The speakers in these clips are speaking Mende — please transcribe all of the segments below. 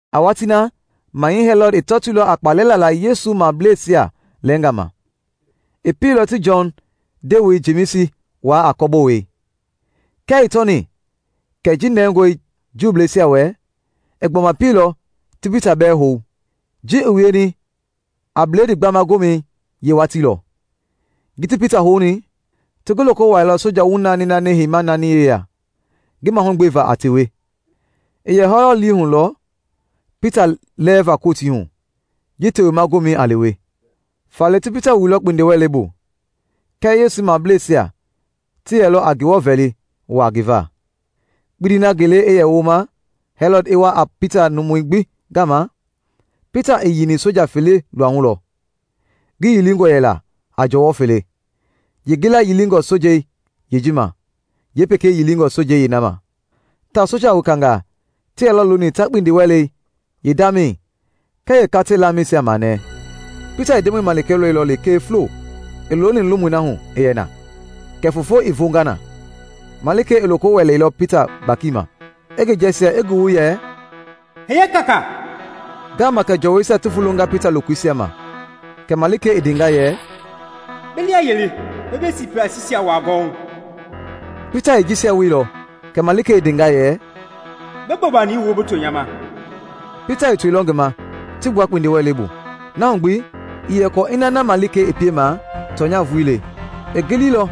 A watii na Mahɛi Hɛlɔd i tɔtoilɔ a kpalɛ lala Yesu mableisia lɛɛnga ma. I pielɔ ti Jɔn ndewei Jemisi waa a kɔbowei. Kia i tɔni kɛ ji nɛngɔe Juuisia wɛ, i gbɔma pielɔ ti Pita bɛɛ hou. Ji i wieni a Bledii Gbama Gomɛi yeewatii lɔ. Ji ti Pita houni, ti ngi loko wuailɔ soja wu naani naani heima naani yeya ngi mahugbeva a tewei. I yɛ Hɛlɔd lii hu lɔ Pita lɛɛva Kotii hu ji Tewema Gomɛi a lewe. Faale ti Pita wuilɔ kpindiwɛlei bu, kɛɛ Yesu mableisia ti yɛlɔ a Ngewɔ vɛli waa ngi va. Kpindi na ngele i yɛ woma Hɛlɔd i wa a Pita numui gbi gama, Pita i yiini soja fele luahu lɔ. Ngi yilingɔ yɛla a jɔwɔ fele, yeengila yilingɔ sojei yeeji ma, yeepekei yilingɔ sojei yeena ma, tawao soja wekangaa ti yɛlɔ looni ta kpindiwɛlei yeendamɛi kɛɛ yeekatei yeendamɛisia manɛɛ. Pita i Ndemɔi malikei lɔilɔ lekee fulo i looni lomui na hu i yɛ na, kɛ foofo i voonga na. Malikei i loko wɛleilɔ Pita gbakima, i ngi jɛɛjia, i ngi wu yɛ, “Hiye kaakaa!” Ngaama kɛ jɔwɔisia ti vulonga Pita lokoisia ma. Kɛ malikei i ndenga yɛ, “Bi liayili, bi bi sipasiisia wuaa gɔwɔhu.” Pita i jisia wielɔ kɛ malikei i ndenga yɛ, “Bi bobani wu bi to nya ma.” Pita i toilɔ ngi ma ti gbua kpindiwɛlei bu. Na hu gbi, ii yɛ kɔɔ ina na malikei i piema tɔnya vulii le; i giliilɔ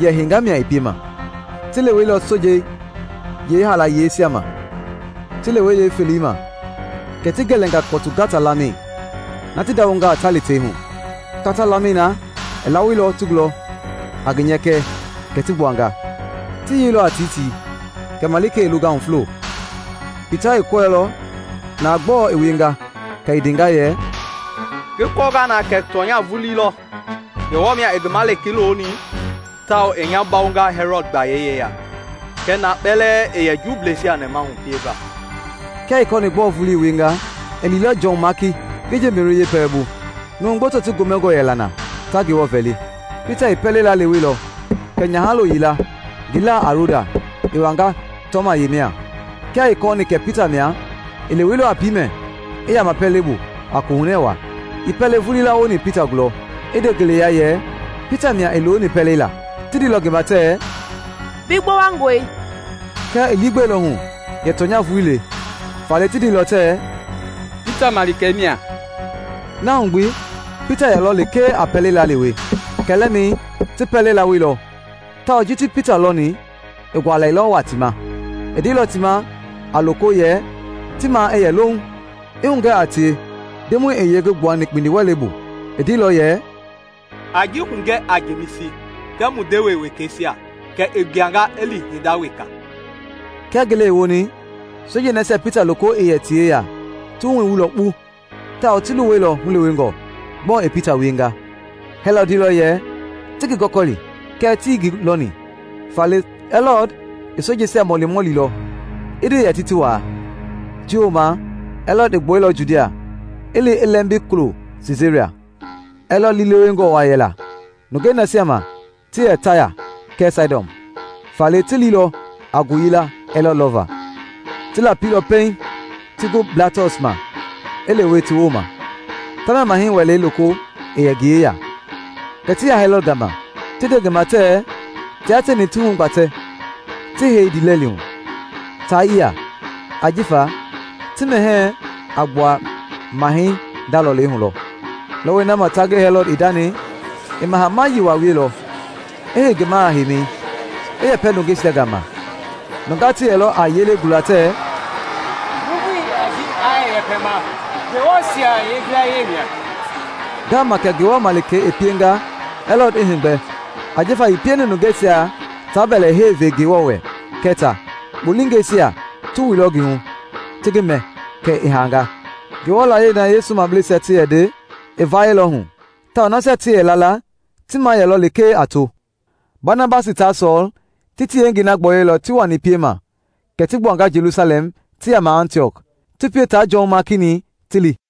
yɛ henga mia i piema. Ti leweilɔ sojei yeehaalayeisia ma. Ti lewe yeefelei ma kɛ ti gɛlɛnga kɔtu gata-laamɛi na ti ndawongaa ta li tei hu. Kata-laamɛi na i lawoilɔ ti gulɔ a ngi nyɛkɛ kɛ ti gbuanga. Ti yeilɔ a tiitii kɛ malikei i longahu fulo. Pita i kɔɛilɔ na gbɔɔ i wienga kɛ i ndenga yɛ, “Ngi kɔɔnga na kɛ tɔnya vulii lɔ! Ngewɔ mia i ngi malikei loni tawao i nya bawonga Hɛlɔd gbayei yeya kɛɛ na kpɛlɛɛ i yɛ Juuisia nɛmahu pieva.” Kia i kɔɔni gbɔɔ vulii i wienga, i liilɔ Jɔn Maaki ngi nje Meri yeepɛlɛbu. Numu gboto ti gomɛngɔ yɛla na ta Ngewɔ vɛli. Pita i pɛlei laaleweilɔ kɛ nyahalo yila, ngi laa a Roda, i wanga tɔma ye mia. Kia i kɔɔni kɛ Pita mia, i leweilɔ a piimɛ i yaama pɛlei bu a kohunɛ waa, ii pɛlei vulii lawoni Pita gulɔ, i nde ngeleya yɛ Pita mia i looni pɛlei laa. Ti ndeilɔ ngi ma tɛɛ, “Bi gbowangɔe!” Kɛɛ i liigbɛilɔ hu yɛ tɔnya vulii le. Faale ti ndeilɔ tɛɛ, “Pita malikei mia.” Na hu gbi Pita yɛlɔ lekee a pɛlei laalewe. Kɛlɛmɛi ti pɛlei lawoilɔ tawao ji ti Pita lɔni i gualɛilɔ waa ti ma. I ndeilɔ ti ma a loko yɛ ti maa i yɛ louŋ, i hugɛ a tie Ndemɔi i yee ngi gbuani kpindiwɛlei bu. I ndeilɔ yɛ, “A ji hugɛ a Jemisi kɛɛ mu ndewe wekeisia. Kɛ i gbuanga i li hinda weka.” Kia ngele i woni, sojei nasia Pita loko i yɛ ti yeya ti wuhu i wuilɔ kpu tawao ti luwɛilɔ hulewengɔ; gbɔɔ i Pita wienga? Hɛlɔd ndeilɔ yɛ ti ngi gɔkɔli, kɛɛ tii ngi lɔni. Faale Hɛlɔd i sojeisia mɔlimɔlilɔ, i nde yɛ ti ti waa. Ji wooma Hɛlɔd i gbuɛilɔ Judia, i li i lɛmbi kulo Siisaria. Hɛlɔd liilewengɔ waa yɛla nungei nasia ma ti yɛ Taya kɛɛ Saidɔn; faale ti liilɔ a ngoyila Hɛlɔd lɔva. Ti lapilɔ pɛiŋ ti gu Blastɔs ma i lewe ti wooma; tamia Mahɛi wɛlei loko i yɛ ngi yeya. Kɛ ti ya Hɛlɔd gama ti nde ngi ma tɛɛ tia tieni ti hugbatɛ ti hei ndiilɛli hu, taa yia, ajifa ti mɛhɛɛ a gbua Mahɛi nda lɔlei hu lɔ. Lɔwɔi na ma ta ngi Hɛlɔd i ndani, i maha-mayii waa wielɔ, i hei ngi maha-heimi, i yɛpɛ nungeisia gama. Nungaa ti yɛlɔ a yelei gula tɛɛ, “Nuuvu yaa ji aa yɛ yɛpɛma, ngewɔɛisia yilayee mia!” Ngaama kɛ Ngewɔ malikei i pienga Hɛlɔd i heegbɛ ajifa ii pieni nungeisia taa mbɛlɛhei ve Ngewɔ wɛ kɛ ta. Kpolingɛisia ti wuilɔ ngi hu, ti ngi mɛ, kɛ i haanga. Ngewɔ yiɛi na Yesu mableisia ti yɛ nde i vayɛilɔ hu tawao nasia ti yɛ la la ti maa yɛlɔ lekee a to. Banabasi taa Sɔɔl ti ti yengei na gbɔyɔilɔ ti wani piema kɛ ti gbuanga Jelusalɛm ti yaama Antiɔk, ti pie taa Jɔn Maaki-ni ti li.